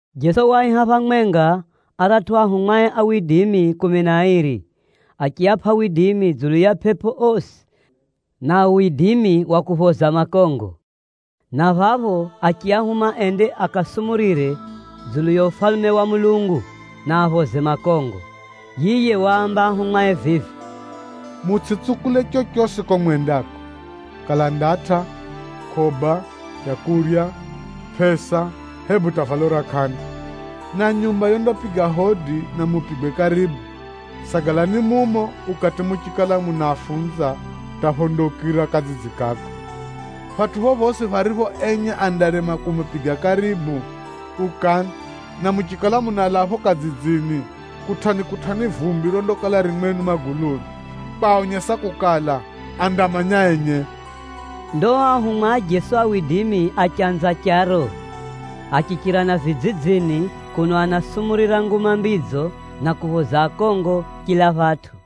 Jeso waaiha phamwenga aratʼu ahumwae kumi na airi, achiapʼa widimi dzulu ya pʼepʼo osi na widimi wa kuphoza makongo, na phapho achiahuma ende akasumurire dzulu ya Ufalume wa Mulungu, na aphoze makongo. Yiye waamba ahumwae vivi, “Mutsʼitsukule chochosi kuko mwendako: kala ndatʼa, mukʼoba, leu, pʼesa, hebu hata valo ra kʼanda. Na nyumba yondapiga hodi na mupigwe karibu, sagalani mumo ukati muchikala munafunza hata phondaukira kadzidzi kako. Phatʼu phophosi pharipho enye andarema kumupiga karibu, ukani, na muchikala munalaa phapho kadzidzini, kutʼani-kutʼani vumbi rondakala ririro mwenu maguluni, kwaonyesa kukala, andamanya enye.” Ndo ao anafunzi a Jeso achanza charo, achichira na vidzidzini kuno anasumurira Nguma Mbidzo na kuphoza akongo chila phatʼu.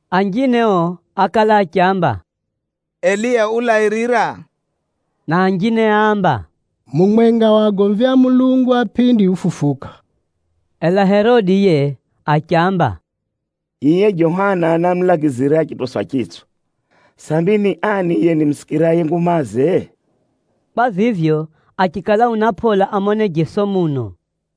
Anjine ao ákala achiamba, “Eliya ulairira,” na anjine áamba, “Mumwenga wa agomvi a Mulungu a pʼindi ufufuka.” Ela Herode yiye achiamba, “Yiye Johana námulagizira achitoswa chitswa, sambi ni ani yiye nimusikiraye ngumaze?” Kwa vivyo, achikala una pʼola amone Jeso muno.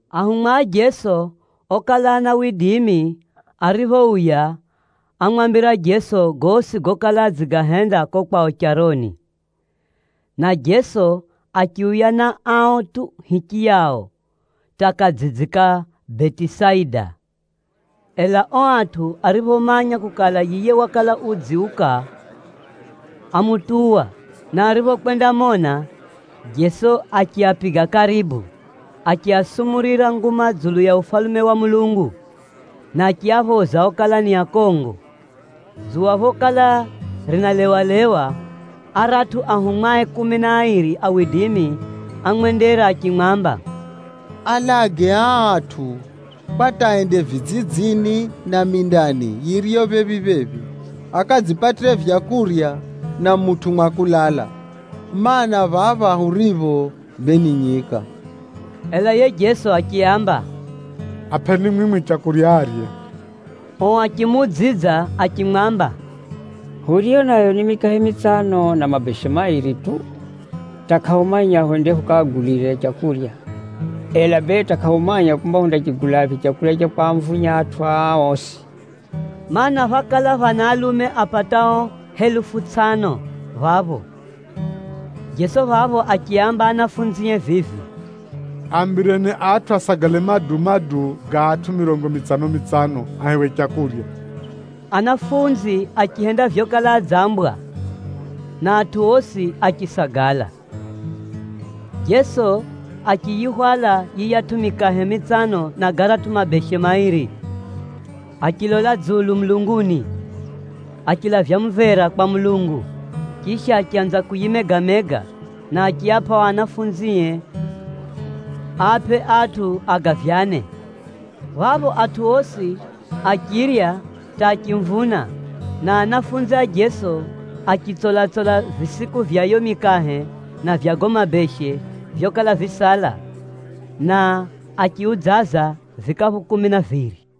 Anafunzi a Jeso ariphouya, ámwambira Jeso gosi gokala adzigahenda kuko kwao charoni, na Jeso achiuya na ao tu hichiyao hata kadzidzi ka kuko Betisaida. Ela ao atʼu ariphomanya kukala yiye wakala udziuka, ámutuwa, na ariphokwendamona, Jeso achiapiga karibu, achiasumurira nguma dzulu ya Ufalume wa Mulungu, na achiaphoza okala ni akongo. Dzuwa phokala rinalewalewa, aratʼu anafunzie kumi na airi ámwendera achimwamba, “Alage aa atʼu kwa hata ende vidzidzini na mindani yiriyo phephi-phephi, akadzipatire maleu na mutʼu mwa kulala, mana, phapha huripho bee ni nyika.” Ela yiye Jeso achiaamba, “Apʼeni mwimwi leu arye.” Ao achimuudzidza achimwamba, “Huriyo nayo ni mikahe mitsano na mabeshe mairi tu, hata kʼahumanya hwende hukaagulirephi leu, ela bee hata kʼahumanya kumba hundarigulaphi leu ra kwamvunya atʼu aa osi!” Maana, phákala phana alume apatao helufu tsʼano phapho. Jeso phapho achiaamba anafunzie vivi, “Aambireni atʼu asagale maduu-maduu ga atʼu mirongo mitsano-mitsano ahewe leu.” Anafunzi achihenda vyokala adzambwa, na atʼu osi achisagala. Jeso achiyihwala yiyatʼu mikahe mitsano na garatʼu mabeshe mairi, achilola dzulu mulunguni, achilavya mumvera kwa Mulungu, chisha achanza kuyimega-mega, na achiapʼa ao anafunzie aapʼe atʼu agavyane. Phapho atʼu osi achirya hata achimvuna, na anafunzi a Jeso achitsola-tsola visiku vya yiyo mikahe na vya gago mabeshe vyokala visala, na achiudzaza vikaphu kumi na viri.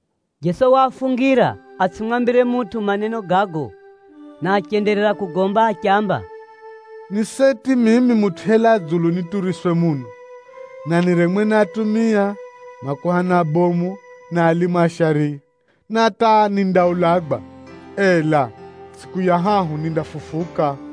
Jeso waafungira atsʼimwambire mutʼu maneno gago, na achenderera kugomba achiamba, “Ni seti mimi Mutʼu yelaa dzulu nituriswe muno, na niremwe ni atumia, makuhani abomu, na alimu a shariya. Na hata nindaulagwa, ela tsʼiku ya hahu nindafufuka.”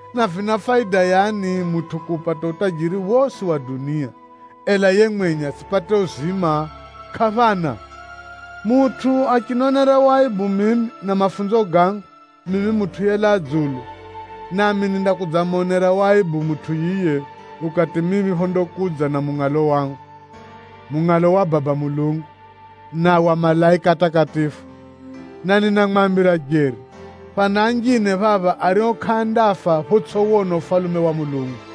Na vina faida yani mutʼu kuupata utajiri wosi wa dunia, ela yiye mwenye atsʼipate uzima? Kʼaphana! Mutʼu achinionera waibu mimi na mafunzo gangu, mimi Mutʼu yelaa dzulu nami nindakudzamonera waibu mutʼu yiye ukati mimi phondakudza na mungʼalo wangu, mungʼalo wa Baba Mulungu, na wa malaika atakatifu. Na ninamwambira jeri, phana anjine phapha ario kʼaandafa photsʼiwona Ufalume wa Mulungu.”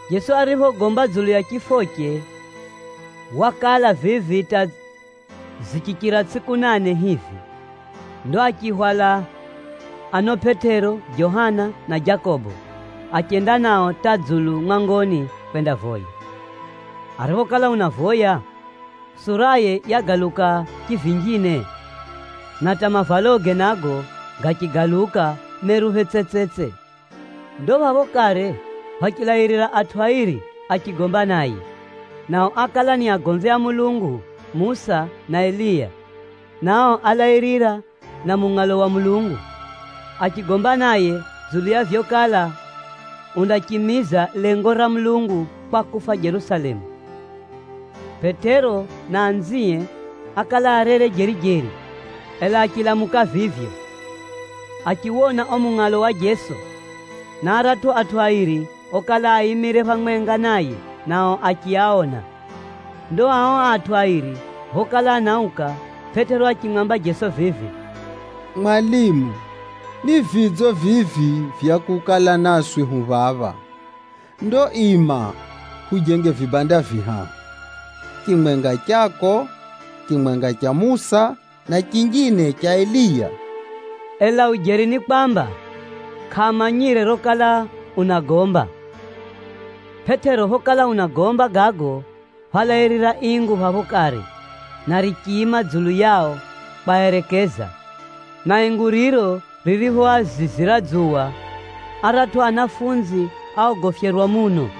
Jeso ariphogomba dzulu ya chifoche, wakala vivi hata zichichira tsʼiku nane hivi, ndo achiahwala ano Pʼetero, Johana na Jakobo, achenda nao hata dzulu mwangoni kwendavoya. Ariphokala unavoya, suraye yagaluka chivinjine, na hata mavaloge nago gachigaluka meruphe tsetsetse. Ndo phapho kare phachilairira atʼu airi achigomba naye, nao ákala ni agomvi a Mulungu Musa na Eliya, na ao álairira na mungʼalo wa Mulungu, achigomba naye dzulu ya vyokala undachimiza lengo ra Mulungu kwa kufa Jerusalemu. Pʼetero na anzie ákala arere jeri-jeri, ela achilamuka vivyo, achiwona uo mungʼalo wa Jeso, na aratʼu atʼu airi okala aimire phamwenga naye nao achiaona. Ndo ao atʼu airi phokala anauka, Pʼetero achimwamba Jeso vivi, “Mwalimu, ni vidzo vivi vya kukala naswi hu phamwenga phapha, ndo ima hujenge vibanda vihahu: chimwenga chako, chimwenga cha Musa, na chinjine cha Eliya.” Ela ujeri ni kwamba, kʼamanyire rokala unagomba. Pʼetero phokala unagomba gago, phálairira ingu phapho kare na richiima dzulu yao kwaerekeza, na ingu riro ririphoazizira dzuwa, aratʼu anafunzi áogofyerwa muno.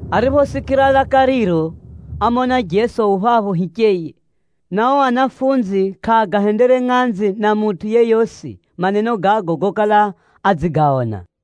Ariphosikira laka riro, ámona Jeso u phapho hicheye, na ao ahumwa kʼaagahendere ngʼanzi na mutʼu yeyosi maneno gago gokala adzigaona.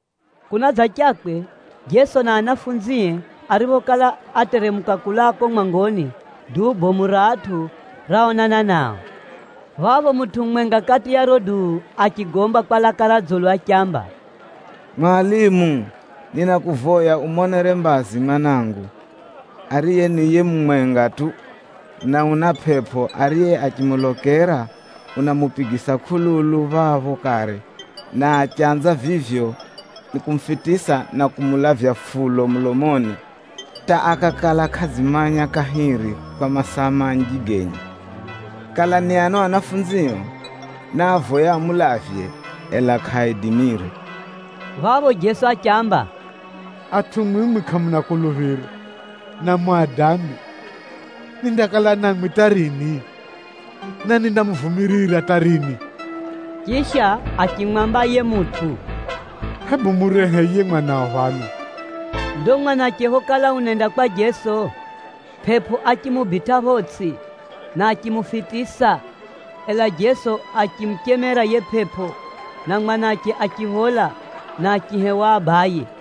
Kunadzachakwe, Jeso na ahumwae ariphokala ateremuka kulaa kuko mwangoni, duu bomu ra atʼu raonana nao. Phapho mutʼu mumwenga kati ya riro duu achigomba kwa laka ra dzulu achiamba, “Mwalimu, ninakuvoya umonere mbazi mwanangu, ariye ni yiye mumwenga tu, na una pʼepʼo ariye achimulokera unamupigisa kʼululu phapho kare, na achanza vivyo nikumufitisa na kumulavya fulo mulomoni hata akakala kʼadzimanya kahiri kwa masaa manji genye. Kala ni ano ahumwao náavoya amulavye, ela kʼaaidimire.” Phapho Jeso achiaamba, “Atʼu mwimwi kʼamuna kuluphiro, na muna dambi! Nindakala na mwimwi hata rini? Na nindamuvumirira hata rini?” Chisha achimwamba yiye mutʼu, “Hebu murehe yiye mwanao phano.” Ndo mwanache phokala unenda kwa Jeso, pʼepʼo achimubitʼa photsʼi, na achimufitisa. Ela Jeso achimuchemera yiye pʼepʼo, na mwanache achiphola na achihewa abaye.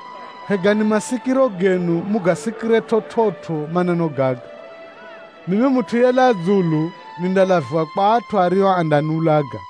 “Hegani masikiro genu mugasikire chividzo maneno gaga: mimi Mutʼu yelaa dzulu nindalaviwa kwa atʼu ario andaniulaga.”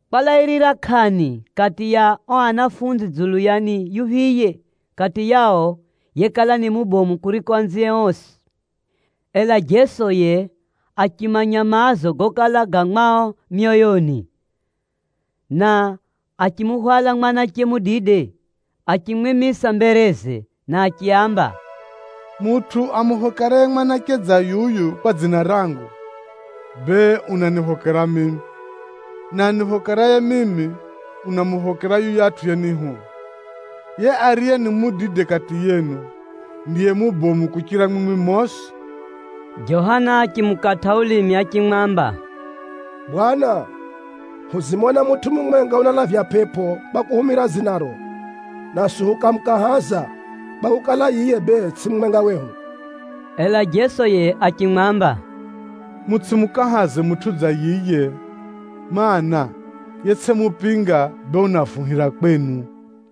Kwalairira kʼani kati ya ao ahumwa dzulu ya ni yuphiye kati yao yekala ni mubomu kuriko anzie osi. Ela Jeso yiye achimanya maazo gokala ga mwao myoyoni, na achimuhwala mwanache mudide achimwimisa mbereze na achiaamba, “Mutʼu amuphokeraye mwanache dza yuyu kwa dzina rangu, bee unaniphokera mimi, na aniphokeraye mimi, unamuphokera hata yuyatʼu yenihuma. Yiye ariye ni mudide kati yenu, ndiye mubomu kuchira mwimwi mosi.” Johana achimukatʼa ulimi achimwamba, “Bwana, hudzimona mutʼu mumwenga unalavya pʼepʼo kwa kuhumira dzinaro, naswi hukamukahaza, kwakukala, yiye bee tsʼiye mumwenga wehu.” Ela Jeso yiye achimwamba, “Mutsʼimukahaze mutʼu dza yiye, mana, yetsʼimupinga bee unavuhira kwenu.”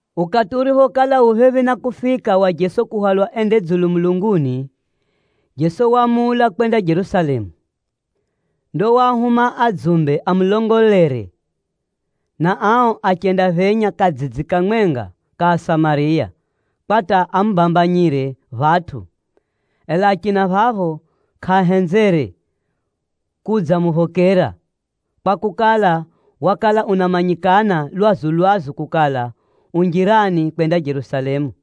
Ukati uriphokala u phephi na kufika wa Jeso kuhwalwa ende dzulu mulunguni, Jeso waamula kwenda Jerusalemu. Ndo waahuma adzumbe amulongolere, na ao achendaphenya kadzidzi kamwenga ka kuko Asamariya, kwa hata amubambanyire phatʼu. Ela achina phapho kʼaahenzere kudzamuphokera, kwakukala, wakala unamanyikana lwazu-lwazu kukala, u njirani kwenda Jerusalemu.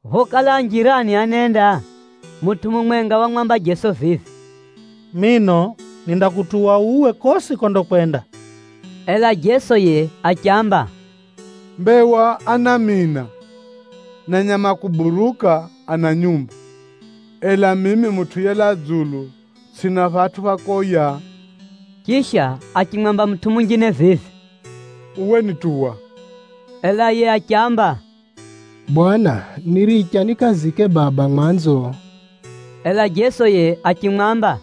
Phokala a njirani anenda, mutʼu mumwenga wamwamba Jeso vivi, “Mino nindakutuwa uwe kosi kondakwenda.” Ela Jeso yiye achiamba, “Mbewa ana miina, na nyama a kuburuka ana nyumba, ela mimi Mutʼu yelaa dzulu tsʼina phatʼu pha kwika mbavu.” Chisha achimwamba mutʼu munjine vivi, “Uwe nituwa.” Ela yiye achiamba, “Bwana, niricha nikazike baba mwanzo, ndo nidze nikutuwe.” Ela Jeso yiye achimwamba,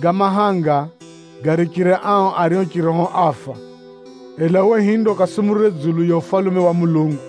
“Ga mahanga garichire ao ario chiroho áfa, ela uwe hinde ukasumurire dzulu ya Ufalume wa Mulungu.”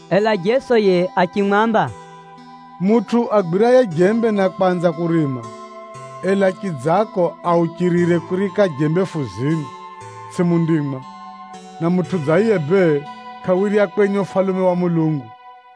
Ela Jeso yiye achimwamba, “Mutʼu agwiraye jembe na kwanza kurima, ela chidzako auchirire kuriika jembe fuzini, tsʼiye mundimwa, na mutʼu dza yiye bee kʼawirya kwenye Ufalume wa Mulungu.”